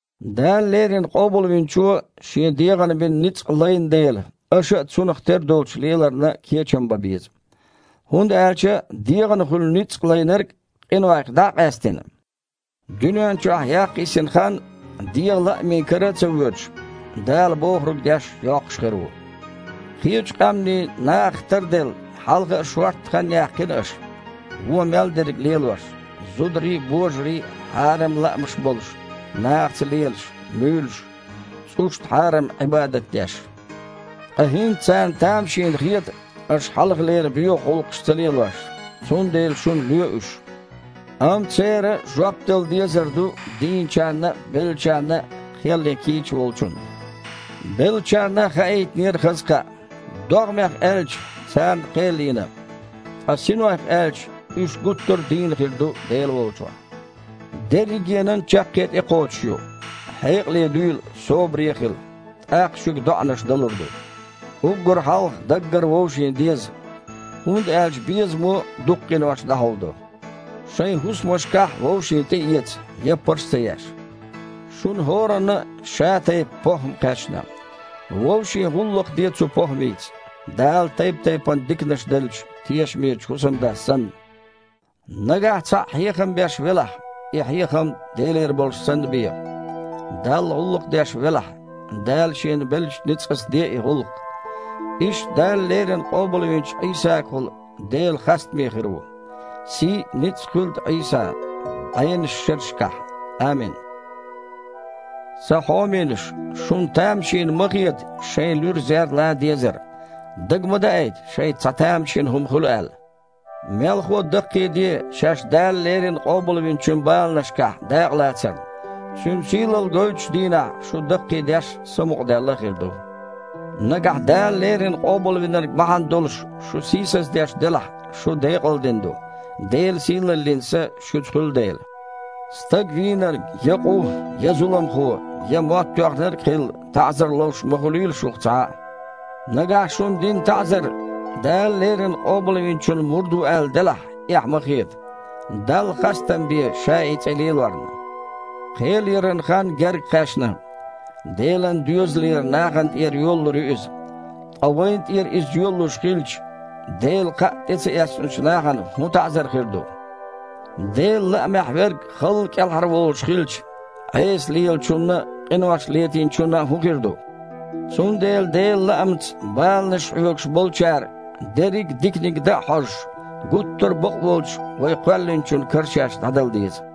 Дала леррина Къобалвинчо Шен дегІана бина ницкъ лайна дела, аша а цунах тера долчу леларна кечам бан беза. ХІунда аьлча дегІана хуьлу ницкъ лайнарг, къинойх дІа а къаьстина, дуьнен чохь яккха йисина хан, дегІан лаамийн кара а ца воьдуш, Дала бохург деш йоккхуш хир ву. Кхечу къаьмнийн нахах тарделла, хьалха а шортта хан яьккхина аша: вон мел дерг лелош, зударий а, божарий а хьарам лаамаш болуш, нахаца лелаш, муьйлуш, цІушна хьарам Іибадат деш. Ткъа хІинца царна тамашийна хета аша хьалхалера боьха гІуллакхаш ца лелош, цундела шуна лоь уьш. Амма церан жоп дала дезар ду дийначарна а, беллачарна а кхел ян кийча Волчунна. Беллачарна а хаийтинера хаза кхаъ. ДогІмех аьлча – царна кхел йина. Ткъа синойх аьлча – уьш гуттар а дийна хир ду Дела волчохь. Дерригенан а чаккхе тІекхочуш ю. Хьекъале дуьйла, собаре а хила, тІаккха шуьга доІанаш далур ду. Уггар хьалха даггара вовшийн деза, хІунда аьлча безамо дукха къинош дІахьулдо. Шайн хІусамашкахь вовшийн тІеэца, яппарш а ца еш. Шуна хІоранна а ша тайпа похІма кхаьчна. Вовшийн гІуллакх де цу похІмица, Дала тайп-тайпана диканаш деллачу тешамечу хІусамдас санна. Нагахь цхьаъ хьехам беш велахь, и хьехам Делера болуш санна бе, Далла гІуллакх деш велахь, Дала шена беллачу ницкъаца де и гІуллакх. Иштта Дала леррина къобалвинчу Іийсагахула Дела хастаме хир ву. Сий а, ницкъ а хуьлда Іийсан бІеннаш шерашкахь, амин! Сан хьоменаш, шуна тамашийна ма хета шайн луьра зер лан дезар, дага ма даийта, шайца цхьа тамашийна хІума хуьлу аьлла. Мелхо а, даккхийде шаьш Дала леррина Къобалвинчун баланашкахь дакъа лацарна. Цуьнан сийлалла гойтучу дийнахь шу даккхийдеш а, самукъадаьлла а хир ду. Нагахь Дала леррина Къобалвинарг бахьана долуш шу сийсаздеш делахь, шу декъалдина ду, Делан сийлаллин Са шуьца хуьлу дела. Стаг вийнарг, я къу, я зуламхо, я мотт тоьхнарг а хилла, таІзар ловш ма хуьлийла шух цхьа а. Нагахь шуна дина таІзар Дала леррина Къобалвинчун мурд ву аьлла делахь, эхь ма хета, Далла хастам бе ша и цІе лелорна! Кхел яран хан герга кхаьчна. Делан доьзалера нахана тІера йолалур ю иза. Ткъа вайна тІера иза йолалуш хилча, Делан Кхаъ тІе ца эцначу нахана хІун таІзар хир ду?! «Делан лаамехь верг халла кІелхьарволуш хилча, Іеса лелачунна а, къинош летийначунна а хІун хир ду?» Цундела Делан лаамца баланаш хьоьгуш болчара, дерриг а диканиг дан а хьожуш, гуттар а Бакъволчу вай Кхоьллинчун кара шаьш дІадала деза.